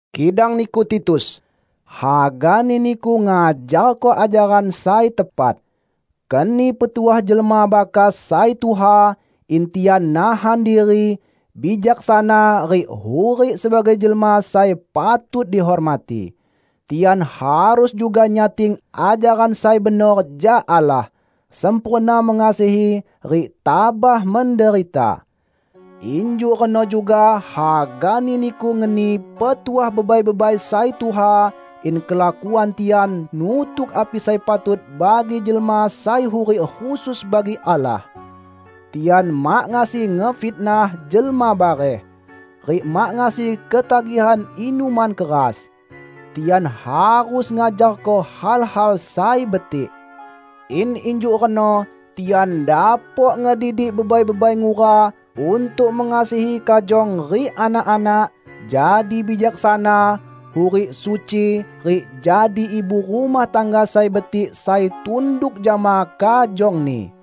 Kidang niku, Titus, hagani niku ngajarko ajaran sai tepat. Keni petuah jelma bakas sai tuha, in tian nahan diri, bijaksana rik hurik sebagai jelma sai patut dihormati. Tian harus juga nyating ajaran sai benor jak Allah, sempurna mengasihi rik tabah menderita. Injuk reno juga hagani niku ngeni petuah bebai-bebai sai tuha in kelakuan tian nutuk api sai patut bagi jelma sai hurik khusus bagi Allah. Tian mak ngasi ngefitnah jelma bareh, rik mak ngasi ketagihan inuman keras. Tian harus ngajarko hal-hal sai betik, in injuk reno tian dapok ngedidik bebai-bebai ngura untuk mengasihi kajong rik anak-anak, jadi bijaksana, hurik suci rik jadi ibu rumah tangga sai betik sai tunduk jama kajongni.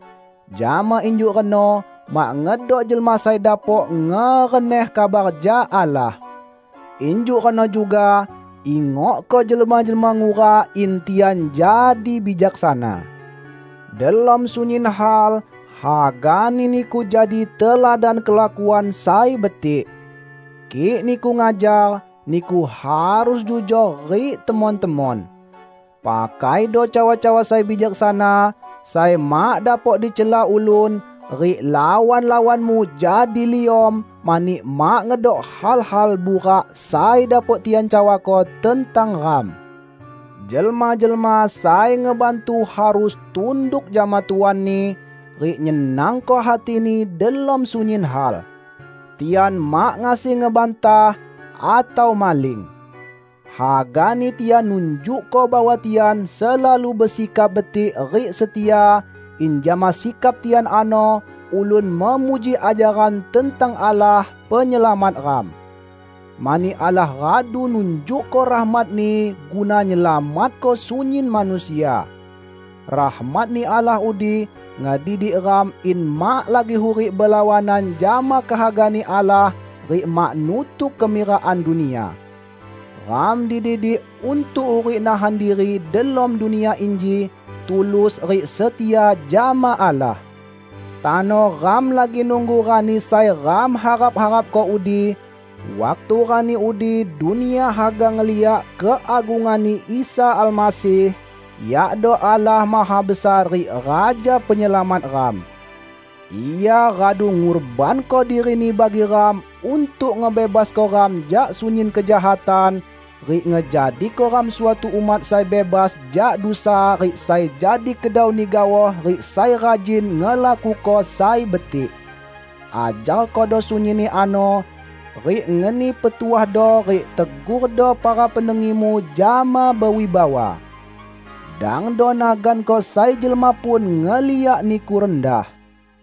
Jama injuk reno mak ngedok jelma sai dapok ngereneh kabar jak Allah. Injuk reno juga, ingokko jelma-jelma ngura in tian jadi bijaksana. Delom sunyin hal, hagani niku jadi teladan kelakuan sai betik. Kik niku ngajar, niku harus jujor rik temon-temon. Pakaido cawa-cawa sai bijaksana, sai mak dapok dicela ulun, rik lawan-lawanmu jadi liom mani mak ngedok hal-hal burak sai dapok tian cawako tentang ram. Jelma-jelma sai ngebantu harus tunduk jama tuanni, rik nyenangko hatini delom sunyin hal. Tian mak ngasi ngebantah, atau maling. Hagani tian nunjukko bahwa tian selalu besikap betik rik setia, in jama sikap tian ano ulun memuji ajaran tentang Allah, Penyelamat ram. Mani Allah radu nunjukko rahmat-Ni guna nyelamatko sunyin manusia. Rahmat-Ni Allah udi ngedidik ram in mak lagi hurik belawanan jama kehaga-Ni Allah rik mak nutuk kemirakan dunia. Ram dididik untuk hurik nahan diri delom dunia inji, tulus rik setia jama Allah. Tano ram lagi nunggu Rani sai ram harap-harapko udi; waktu Rani udi dunia haga ngeliak keagungan-Ni Isa Almasih, yakdo Allah Mahabesar rik Raja Penyelamat ram. Ia radu ngurbanko diri-Ni bagi ram untuk ngebebasko ram jak sunyin kejahatan, rik ngejadiko ram suatu umat sai bebas jak dusa rik sai jadi kedau-Ni gaoh, rik sai rajin ngelakuko sai betik. Ajarkodo sunyinni ano, rik ngeni petuahdo rik tegurdo para pendengimu jama bewibawa. Dangdo naganko sai jelma pun ngeliak niku rendah.